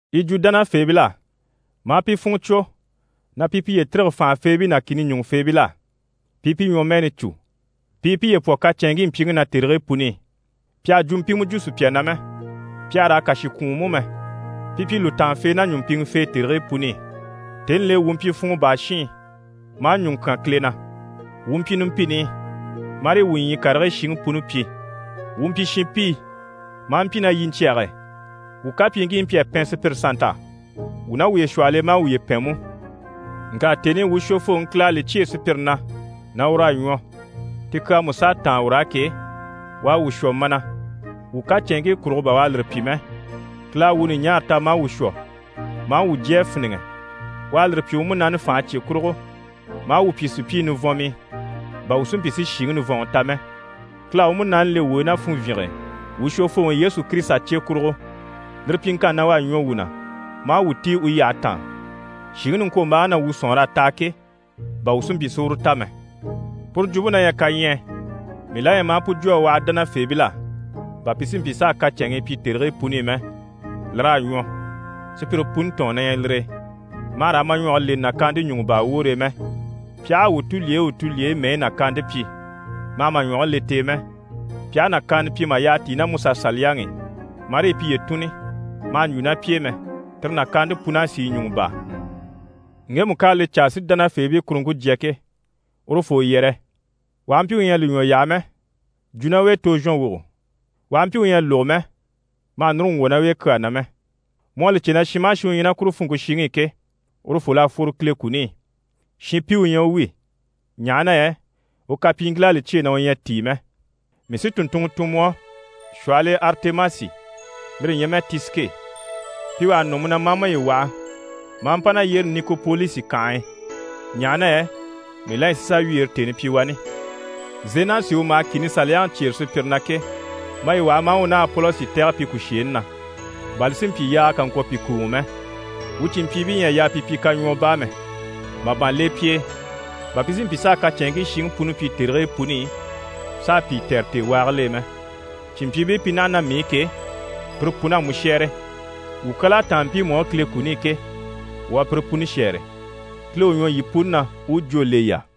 Yi jwo dánafeebil'á ma a pi funŋɔ cwo, na pi piye tîrige fànhafeebii ná kìni ɲùŋufeebil'á, pi i pi ɲwɔmɛɛni cû, pi i piye pwɔ kacɛnŋkii mpyiŋi na tèrigii puni i. Pi àha jwumpimɛ jwo sùpya na mɛ, pi àha raa kàshi kwùun mú mɛ, pi pyi lùtaanfee ná ɲùmpiŋɛfee tèrigii puni i. Tèni l'e, wuu mpyi funŋɔ baa shiin, maa ɲùŋɔ kyán Kile na. Wuu mpyi numpini i, marii wuu ɲyii karigii shiŋi puni pyi. Wuu mpyi shinpii, maa mpyi ná yiɲcyɛge e. Wuu kapyiiŋkii mpyi a pɛn sùpyire sannt'á, wuu ná wuye shwɔhɔl'e maa wuye pɛn mú. Ŋka tèni i wuu Shwofooŋi Kile à li cyêe sùpyire na na ur'à ɲwɔ, ti kyaa mú s'à táan ur'á ke, u à wuu shwɔ mana. Wuu kacɛnŋkii kurugo bà u à lire pyi mɛ. Kile à wuu ɲùɲaara ta maa wuu shwɔ, maa wuu jyé a fíniŋɛ. U à lire pyi u Munaani fànhe cye kurugo, maa wuu pyi sùpyii nivɔnmii bà wuu si mpyi si shìŋi nivɔnŋi ta mɛ. Kile à u Munaani le wuu e ná funvyinge e, wuu Shwofooŋi Yesu Kirisita cye kurugo. Lire pyiŋkanni na, u à ɲwɔ wuu na maa wuu tíi u yyahe taan, shìŋi niŋkwombaaŋi na wuu sɔ̀nŋɔr'à taha ke, bà wuu si mpyi si uru ta mɛ. Puru jwumpe na ɲyɛ kaɲyɛɛ. Mii la ɲyɛ ma a pu jwo a waha dánafeebil'á bà pi si mpyi s'a kacɛnŋii pyi tèrigii puni i mɛ. Lir'à ɲwɔ, sùpyire puni tɔ̀ɔn na ɲyɛ lire e. Ma hà raa ma ɲwɔge leni nàkaante ɲùŋɔ baa woore e mɛ. Pi aha a wuu tulyeyi u tulyeyi mɛyi nàkaante pyi, ma hà ma ɲwɔge le t'e mɛ. Pi aha nàkaana pyi mà yyaha tíi ná MusaSaliyaŋi i marii piye tùnni, ma hà ɲjwo ná pi e mɛ. Tire nàkaante pun'à sìi ɲùŋɔ baa. Ŋgemu ká a li caa si dánafeebii kuruŋke jya ke, urufoo yɛrɛ, u aha mpyi u ɲyɛ a li ɲwɔ yaha mɛ, jwo ná u e tozhɔnwogo. U aha mpyi u ɲyɛ a lógo mɛ, ma hà núru ŋgwɔ̀ ná u e kyaa na mɛ. Mu à li cè na shin maha shin u ɲyɛ ná kuru funŋke shiŋi i ke, urufol'à fworo Kile kuni i, shinpi u ɲyɛ u wi, ɲaha na yɛ u kapyiiŋkil'à li cyêe na u ɲyɛ a tíi mɛ. Mii sí tùnntunŋɔ tun mu á, shwɔhɔl'e Aritemasi, lire ɲyɛ mɛ Tisike. Pi wà ha nɔ mu na, ma a maye waha, ma a mpa na yyére Nikopolisi kànhe e, ɲaha na yɛ mii la ɲyɛ si sà wyeere tèni pyi wani. Zenasi u maha kìni saliyaŋi cyêre sùpyire na ke, maye waha ma a u ná Apolosi tɛ̀gɛ pi kùsheeni na, bà li si mpyi yaaga kà ŋkwɔ̀ pi kùuŋɔ mɛ. Wuu cìnmpyiibii ɲyɛ a yaa pi pyi kaɲwɔɔ baa mɛ. Màban le pi e bà pi si mpyi s'a kacɛnŋkii shiŋi puni pyi tèrigii puni i s'a pìi tɛ̀re tèewaagil'e mɛ. Cìnmpyiibii pi naha naha ná mii i ke, pire pun'à mu shɛ́ɛre. Wuu kyal'à táan mpiimu á Kile kuni i ke, wuu à pire puni shɛ́ɛre. Kile u ɲwɔ yii puni na, u u jwó le yii á.